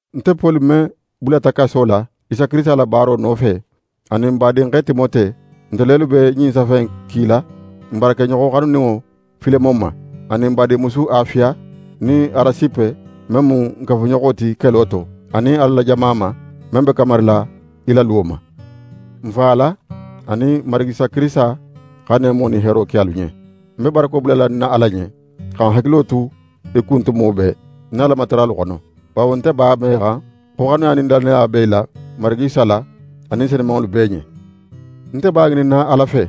Nte Poli men bulata kaso la Isa Kirisita la baaro nofe, anin n badinxe Timote, nte lelu be ɲin safe in kila n baarakeɲoxo xanuninŋo Filemon ma, anin n badinmusu Afiya nin Arasipe men mu n kafuɲoxo ti kelo to, anin Ala la jama ma, men be kamarila í la luwo ma. N Fa Ala anin Marigi Isa Kirisita xa neemo nin heero ke alu ɲen. Ń be barako bulala ń na Ala ɲen, xa ń hakilo tu í kun tumo bee, ń na Alamataralu xono; bawo nte b'a mexan xo xanuya nin lannaya be í la Marigi Isa la anin senumanŋolu bee ɲen. Nte be a ŋininna Ala fe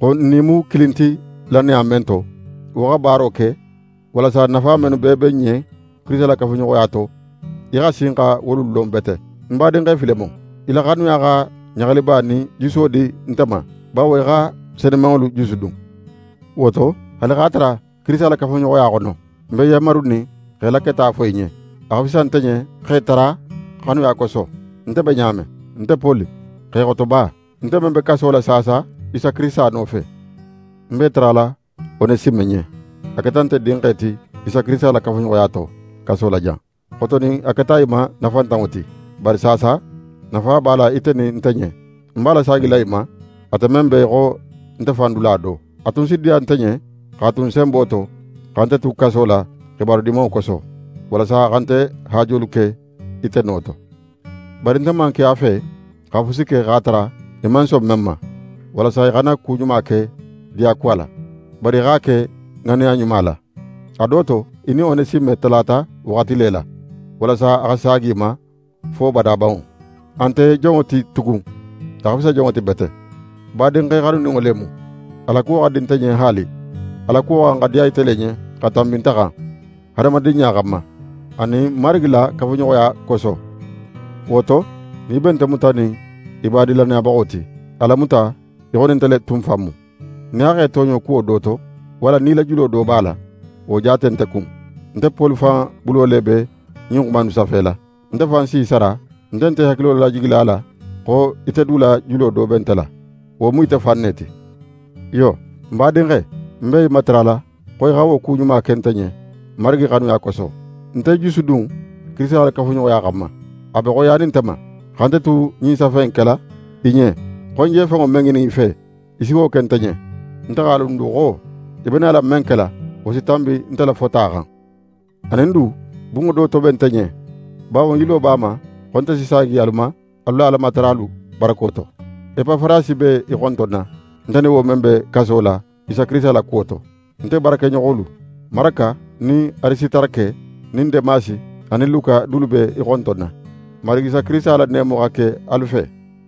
xo n nin í mu kilin ti lannaya men to, wo xa baaro ke, walasa nafa mennu bee be n ɲen Kirisita la kafuɲoxoya to, í xa sin xa wolu lon bete. Ń badinxe Filemon, í la xanuya xa ɲaxaliba nin juso di nte ma, bawo í xa senumanŋolu jusudun. Wo to, haali x'a tara Kirisita la kafuɲoxoya xono, ń be yanmarunin x'é la keta fo í ɲen, a xa fisa nte ɲen x'é tara xanuya koso. Nte be ɲa men, nte Poli, xexotoba, nte men be kaso la saasa Isa Kirisita nofe, ń b'é tarala Onesime ɲen. A keta nte dinxe ti Isa Kirisita la kafuɲoxoya to, kaso la jan. Xotonin a keta í ma nafantanŋo ti, bari saasa, nafa b'a la ite nin nte ɲen. Ń b'a lasaagila í ma, ate men be í xo nte fan dula do. A tun si diya nte ɲen x'a tu ń senbo to, xa nte tu kaso la xibaru Dimanŋo koso, walasa a xa nte haajolu ke ite no to. Bari nte man ke a fe xa fusi ke x'a tara í man son men ma, walasa í xana ku ɲuma ke diyakuwa la, bari í x'a ke ŋanneya ɲuma la. A do to, í nin Onesime talata waxati le la, walasa a xa saagi í ma fo badabanŋo. A nte jonŋo ti tugun, a xa fisa jonŋo ti bete, badinxe xanuninŋo le mu. A la kuwo xa di nte ɲen haali. A la kuwo xa xan xa diya ite le ɲen xa tanbi nte xan, hadamadinɲa xanma, anin Marigi la kafuɲoxoya koso. Wo to, nin í be nte mutanin í badin lannayabaxo ti, a lamuta í xo nin nte le tun fan mu. Nin a x'é tooɲo kuwo do to, walla nin í la julo do b'a la, wo jaate nte kun. Nte Poli fan bulo le be ɲin xuma innu safela: Nte fan si í sara. Nte nte í hakilo lajigila a la xo ite du la julo do be nte la, wo mu ite fan ne ti. Iyo, ń badinxe, ń be í matarala xo í xa wo ku ɲuma ke nte ɲen Marigi xanuya koso: Nte jusudun Kirisita la kafuɲoxoya xanma. A be xoyiyanin nte ma, xa nte tu ɲin safe in kela í ɲen xo ń je fenŋo men ŋinin í fe, í si wo ke nte ɲen. Nte x'a lon du xo í be nala men kela, wo si tanbi nte la fota xan. Anin du, bunŋo do toben nte ɲen, bawo ń yilo b'a ma xo nte si saagi alu ma, alu la Alamataralu barako to. Epafarasi be í xontonna, nte nin wo men be kaso la Isa Kirisita la kuwo to. Nte baarakeɲoxolu: Maraka, nin Arisitarake, nin Demasi anin Luka dulu be í xontonna. Marigi Isa Kirisita la neemo xa ke alu fe!